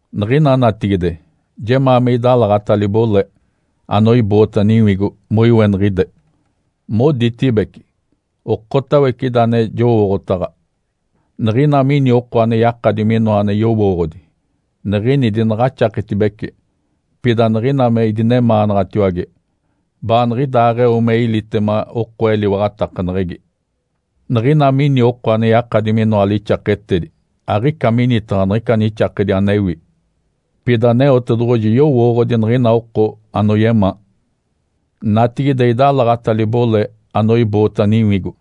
Niɡ̶ina natigide jemaa me idalaɡ̶ata libole anoiboota niwigo moiweniɡ̶ide. Moditibece, “Okotawece ida ane jowooɡ̶otaɡ̶a.” Niɡ̶ina mini oko ane yakadi minoa ane yowooɡ̶odi, niɡ̶ini dinaɡ̶axaketibece, pida niɡ̶ina me idinemaanaɡ̶atiwage, baaniɡ̶idaaɡ̶eo me ilitema oko eliwaɡ̶atakaneɡ̶egi. Niɡ̶ina mini oko ane yakadi minoa lixaketedi, aɡ̶ica minitaɡ̶a niɡ̶ica nixakedi anewi. Pida Aneotedoɡ̶oji yowooɡ̶odi niɡ̶ina oko anoyemaa. Natigide idalaɡ̶ata libole anoiboota niwigo.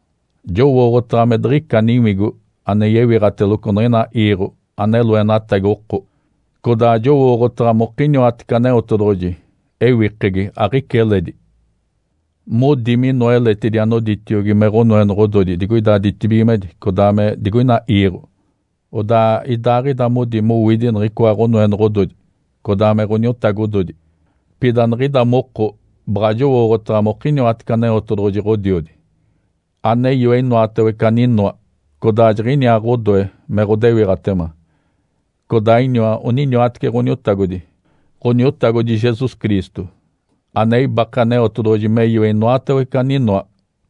Jowooɡ̶otaɡ̶a me diɡ̶ica niwigo ane yewiɡ̶ateloco niɡ̶ina iiɡ̶o ane loenatagi oko, codaa jowooɡ̶otaɡ̶a mokiniwatece Aneotedoɡ̶oji ewikegi, aɡ̶ica eledi. Modi minoa eletidi anoditiogi me ɡ̶onoenoɡ̶ododi digoida ditibigimedi, codaa me digoina iiɡ̶o, odaa idaaɡ̶ida modi mowidi niɡ̶icoa ɡ̶onoenoɡ̶ododi codaa me ɡ̶oniotagododi. Pida niɡ̶ida moko baɡ̶a jowooɡ̶otaɡ̶a mokiniwatece Aneotedoɡ̶oji, Ǥodiodi, ane yoe inoatawece aninoa, codaa jiɡ̶iniaa ɡ̶odoe me ɡ̶odewiɡ̶atema. Codaa iniwa oniniwatece Ǥoniotagodi, Ǥoniotagodi Jesus Cristo, ane ibake Aneotedoɡ̶oji me yoe inoatawece aninoa,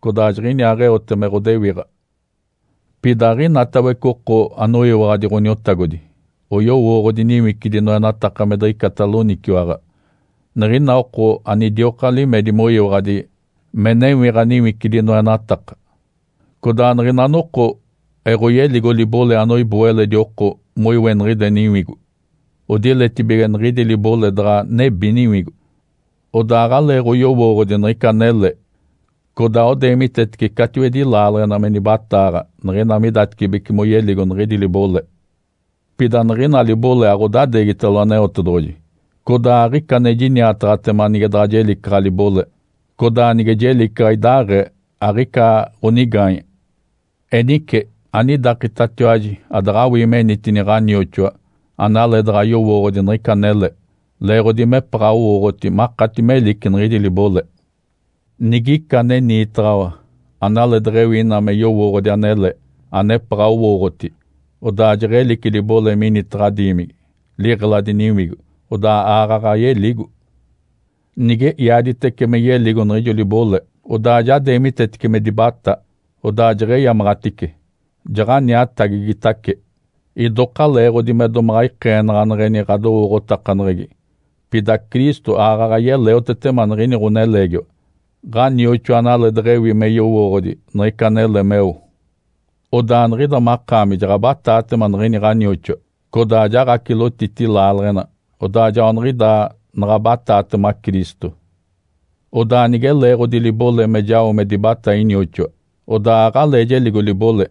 codaa jiɡ̶iniaaɡ̶eote me ɡ̶odewiɡ̶a. Pida aɡ̶inatawece oko anoyiwaɡ̶adi Ǥoniotagodi oyowooɡ̶odi niwicidi noenataka me diɡ̶ica loniciwaɡ̶a. Niɡ̶ina oko anidioka limedi moyiwaɡ̶adi me newiɡ̶a niwicidi noenataka. Codaa niɡ̶ina noko eɡ̶oyeligo libole anoiboo eledi oko moiweniɡ̶ide niwigo, odiletibige niɡ̶idi libole daɡ̶a nebi niwigo. Odaa aɡ̶aleeɡ̶oyowooɡ̶odi niɡ̶ica anele, codaa odeemitetece catiwedi laaleɡ̶ena me nibataaɡ̶a niɡ̶ina midatecibece moyeligo niɡ̶idi libole. Pida niɡ̶ina libole aɡ̶odadeegitalo Aneotedoɡ̶oji. Codaa aɡ̶ica ane jiniataɡ̶atema nige daɡ̶a jelicaɡ̶a libole, codaa nige jelicaɡ̶a idaaɡ̶ee aɡ̶ica ɡ̶onigaanye. Enice anidakitatiwaji adaɡ̶awii menitini ɡ̶anioxoa analeedaɡ̶a yowooɡ̶odi niɡ̶ica anele, leeɡ̶odi mepaɡ̶a owooɡ̶oti makati melici niɡ̶idi libole. Nigica ane niitaɡ̶awa analee deɡ̶ewi ina me yowooɡ̶odi anele, anepaɡ̶a noɡ̶owooɡ̶oti, odaa jeɡ̶elici libole minitaɡ̶a diimigi, liɡ̶eladi niwigo, odaa aaɡ̶aɡ̶a yeligo. Nige iaditece me yeligo niɡ̶ijo libole, odaa ja deemitetece me dibatá, odaa jeɡ̶eyamaɡ̶atice, jaɡ̶aniatagigitace, idoka leeɡ̶odi me domaɡ̶a ikeenaɡ̶aneɡ̶eni ɡ̶adowooɡ̶otakaneɡ̶egi. Pida Cristo aaɡ̶aɡ̶a yeleotetema niɡ̶ini ɡ̶oneleegiwa, ɡ̶anioxoa analee deɡ̶ewi me yowooɡ̶odi niɡ̶ica anele meo. Odaa niɡ̶ida makaami jaɡ̶abataatema niɡ̶ini ɡ̶anioxoa codaa jaɡ̶acilotiti laaleɡ̶ena, odaa joaniɡ̶idaa naɡ̶abataatema Cristo. Odaa nige leeɡ̶odi libole me jao me dibatá inioxoa, odaa aɡ̶alee jeligo libole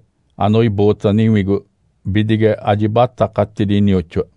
anoiboota niwigo bidige ajibatakatidi inioxoa.